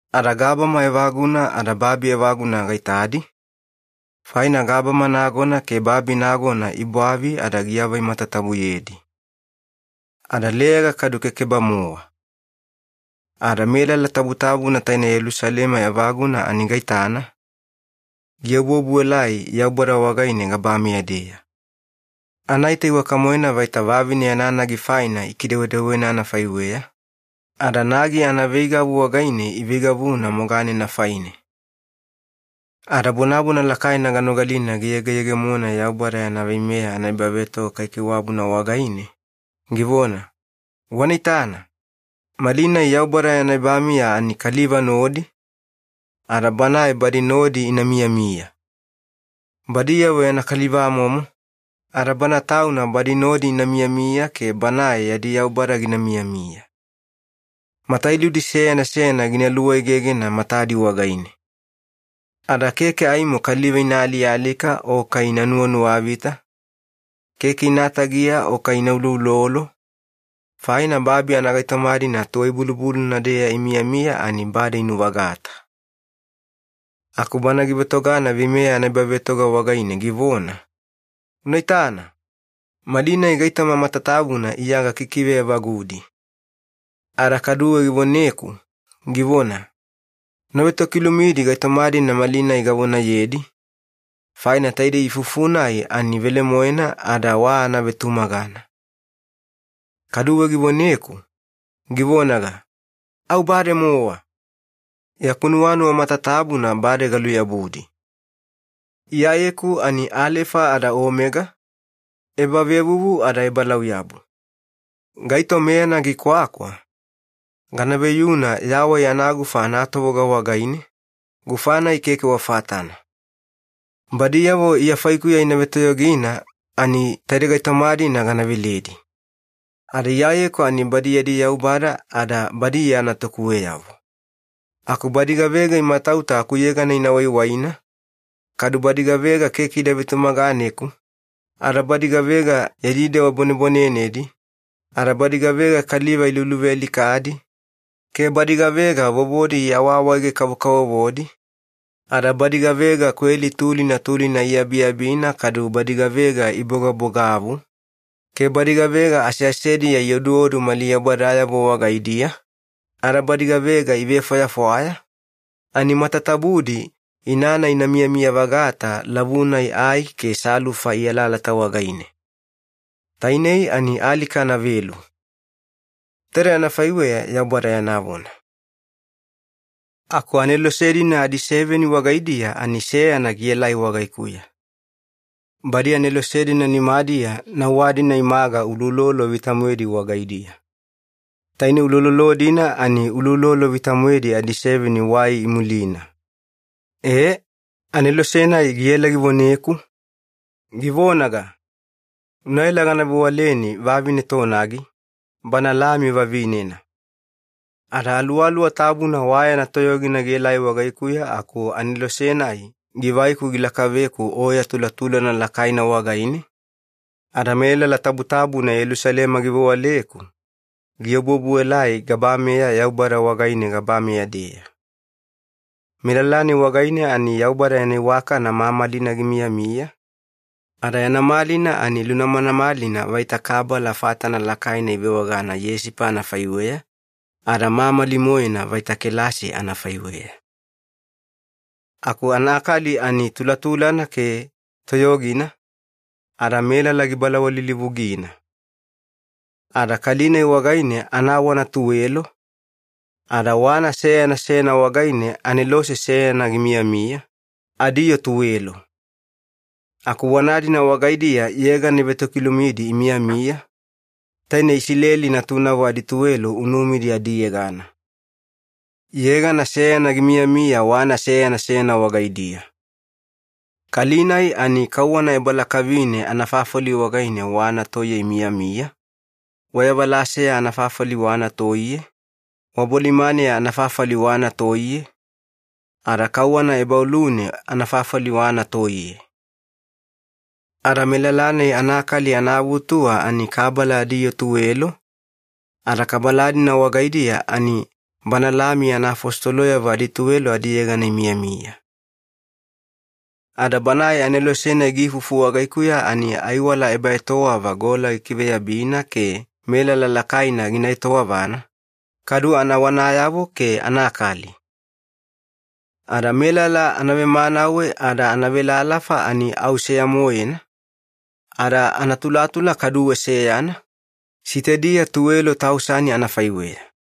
Ada gabama evaguna ada babi evaguna gaitadi, faina gabama nagona ke babi nagona ibwavi ada giavai matatabuyedi. Ada leyaga kadu keke-bamowa. Ada melala tabutabuna taine Yelusalema evaguna ani gaitana, giobuobuelai Yaubada wagaine gabameya-deya. Anaita iwaka-moena vaita vavine yana nagi faina ikidewedewena anafaiweya, ada nagi anaveigavu wagaine iveigavuna moganena faine. Ada bonabona lakaina ganogalina giyegeyegemona Yaubada yana veimeya anaebavetoga kaikaiwabuna wagaine, givona, “Wana itana, malinai Yaubada yana ebamiya ani kaliva nodi, ada Banae badi nodi ina miyamiya. Badiyavo yana kalivamomo, ada Bana Tauna badi nodi ina miyamiya ke Banae yadi Yaubada gina miyamiya. Matailudi seyana seyana gina luegegena matadi wagaine. Ada keke aimo kaliva ina alialika o kai ina nuwanuwavita, keke ina tagiya o kai ina uloulolo, faina babi anagaitoma-dina tuwai-bulubuluna-deya imiyamiya ani bade inuvagata.” Aku Bana givetogana veimeya anaebavetoga wagaine givona, “Una itana, malinai gaitoma matatabuna Iya gakikive evagudi.” Ada kaduwe givoneku, givona, “Una vetokilumidi gaitoma-dina malinai gavonayedi, faina taidei ifufu-nai ani velemoena ada wa anavetumagana.” Kaduwe givoneku, givonaga, “Au bademowa! Yaku nuwanuwa matatabuna bade galuyabudi. Iyayeku ani Alefa ada Omega, ebavevuvu ada ebalauyabu. Gaito meyana gikwakwa, gana veyuna yawai anagufa anatovoga wagaine, gufa-nai keke wa fatana. Badiyavo Iya faikuya ina vetoyogina ani taide gaitoma-dina gana veledi. Ada Iyayeku ani badi yadi Yaubada, ada badi Iya natukuweyavo. Aku badi gavega imatauta akuyegana ina waiwaina, kadu badi gavega keke ida vetumaganeku, ada badi gavega yadi dewa bwanebwanenedi, ada badi gavega kaliva iluluvealikadi, ke badi gavega vovodi iawaawaege-kavokavovodi, ada badi gavega kweli tulina tulina iabiabina kadu badi gavega ibogabogavu, ke badi gavega aseasediya ioduodu mali yaubadayavo wagaidiya, ada badi gavega ivefwayafwaya, ani matatabudi inana ina miyamiya-vagata lavu-nai ai ke salufa ialalata wagaine. Tainei ani alika anavelu.” Taide anafaiweya Yaubada yana vona. Aku anelose-dina adiseveni wagaidiya ani seyana gielai wagaikuya. Badi anelose-dina nimadiya nauwa-dina imaga uloulolo vita-moedi wagaidiya. Taine uloulolo-dina ani uloulolo vita-moedi adiseveni wai imulina. Ee, anelose-nai giela givoneku, givonaga, “Unaela gana vewaleni vavine tonagi, Bana Lami vavinena.” Ada Aluwaluwa Tabuna wa yana toyogina gielai wagaikuya aku anelose-nai givaiku gilakaveku oya tulatulana lakaina wagaine, ada melala tabutabuna Yelusalema givewaleku, giobuobuelai gabameya Yaubada wagaine gabameya-deya. Melala-nai wagaine ani Yaubada yana iwakana mamalina gimiyamiya, ada yana malina ani lunamanamalina vaita kabala fatana lakaina ivewagana yesipa anafaiweya, ada mamali-moena vaita kelasi anafaiweya. Aku anakali ani tulatulana ke toyogina, ada melala gibalawalilivugina. Ada kali-nai wagaine anawana tuwelo, ada wana seyana seyana wagaine anelose seyana gimiyamiya, adiyoo tuwelo. Aku wana-dina wagaidiya yegana ivetokilumidi imiyamiya, taine Isileli natunavo adituwelo unumidi adiyegana. Yegana seyana gimiyamiya wana seyana seyana wagaidiya. Kali-nai ani kauwana ebalakavine anafafali wagaine wana toiye imiyamiya, wayavalaseya anafafali wana toiye, wabolimaneya anafafali wana toiye, ada kauwana ebaolune anafafali wana toiye. Ada melala-nai anakali anaavutuwa ani kabala adiyoo tuwelo, ada kabala-dina wagaidiya ani Bana Lami yana afositoloyavo adituwelo adiyegana imiyamiya. Ada banae anelose-nai giifufu wagaikuya ani aiwala ebaetowava gola gikiveyabina ke melala lakaina gina etowavana, kadu anawanayavo ke anakali. Ada melala anavemanawe ada anavelalafa ani au seya-moena, ada anatulatula kaduwe seyana, sitediya tuwelo tausani anafaiweya.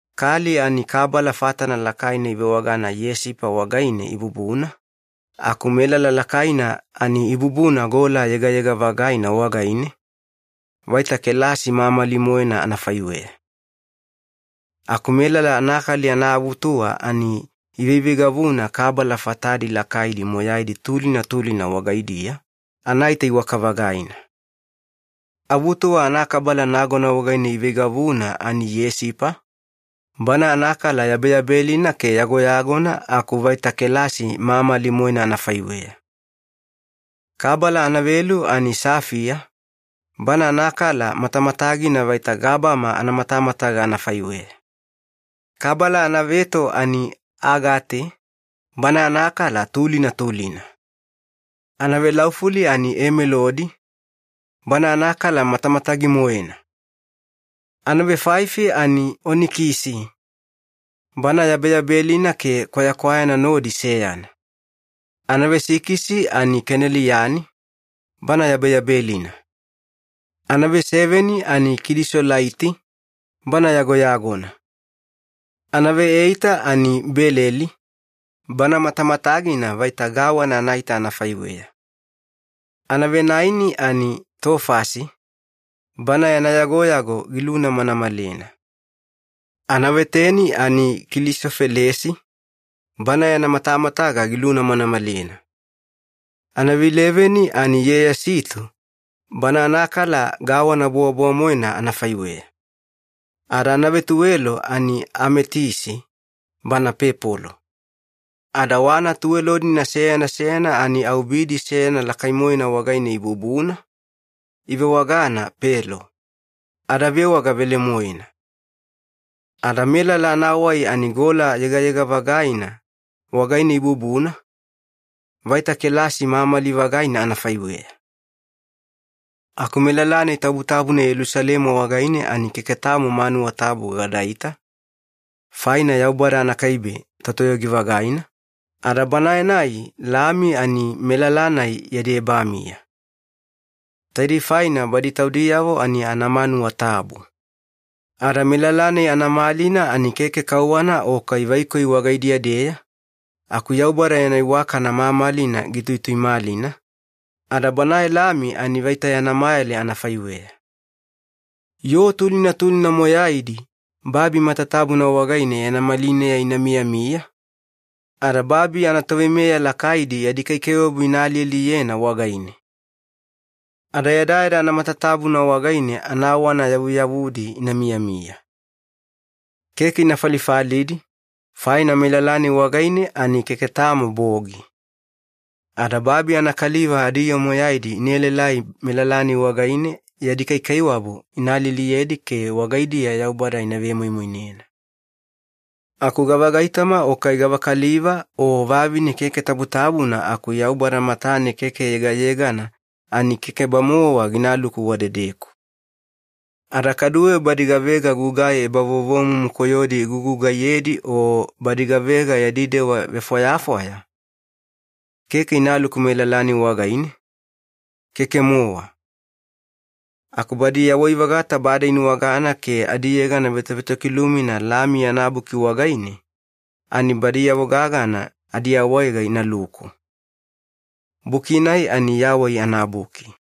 Kali ani kabala fatana lakaina ivewagana yesipa wagaine ibubuna, aku melala lakaina ani ibubuna gola yegayega-vagaina wagaine, vaita kelasi mamali-moena anafaiweya. Aku melala anakali anaavutuwa ani iveiveigavuna kabala fatadi lakaidi moyaidi tulina tulina wagaidiya, anaita iwaka-vagaina. Avutuwa anakabala nagona wagaine iveigavuna ani yesipa, bana anakala yabeyabelina ke yagoyagona aku vaita kelasi mamali-moena anafaiweya. Kabala anavelu ani safaiya, bana anakala matamatagina vaita gabama anamatamataga anafaiweya. Kabala anaveto ani agate, bana anakala tulina tulina. Anavelaufuli ani emeladi, bana anakala matamatagi-moena. Anavefaifi ani onikisi, bana yabeyabelina ke kwayakwayana nodi seyana. Anavesikisi ani keneliani, bana yabeyabelina. Anaveseveni ani kilisolaiti, bana yagoyagona. Anaveeita ani beleli, bana matamatagina vaita gawana anaita anafaiweya. Anavenaeni ani tofasi, bana yana yagoyago gilunamanamalena. Anaveteni ani kulisofelesi, bana yana matamataga gilunamanamalena. Anaveileveni ani yiyasito, bana anakala vaita gawana bowabowa-moena anafaiweya. Ada anavetuwelo ani ametisi, bana pepolo. Ada wana tuwelo-dina seyana seyana ani au bidi seyana lakai-moena wagaine ibubuna, ivewagana ‘pelo’, ada vewaga velemoena. Ada melala anawai ani gola yegayega-vagaina wagaine ibubuna, vaita kelasi mamali-vagaina anafaiweya. Aku melala-nai tabutabuna Yelusalema wagaine ani keke tamo manuwa tabu gadaita, faina Yaubada anakaibe Totoyogi-vagaina ada Banae-nai Lami ani melala-nai yadi ebamiya. Taidei faina badi taudiyavo ani anamanuwa tabu. Ada melala-nai anamalina ani keke kauwana o kai vaikoi wagaidiya-deya, aku Yaubada yana iwakana mamalina gituituimalina, ada Banae Lami ani vaita yana mayale anafaiweya. Yoo tulina tulina moyaidi babi matatabuna wagaine yana malineya ina miyamiya, ada babi anatoveimeya lakaidi yadi kaikaiwabu ina alialiyena wagaine. Ada yadayada anamatatabuna wagaine anawana yavuyavudi ina miyamiya. Keke ina falifalidi, faina melala-nai wagaine ani keke tamo bogi. Ada babi anakaliva adiyoo moyaidi ina elaelai melala-nai wagaine, yadi kaikaiwabu ina alialiyedi ke wagaidiya Yaubada ina vemoimoinena. Aku gavagaitoma o kai gavakaliva o vavine keke tabutabuna aku Yaubada matane keke yegayegana, ani keke-bamowa ginaluku wadedeku. Ada kaduwe badi gavega gugai ebavovomumu koyodi igugugaiyedi o badi gavega yadi dewa vefwayafwaya, keke inaluku melala-nai wagaine, keke-mowa. Aku badi yawai-vagata bade inuwagana ke adiyegana vetovetokilumina Lami yana buki wagaine, ani badiyavo gagana adiawaega inaluku. Buki-nai ani Yawai anaBuki.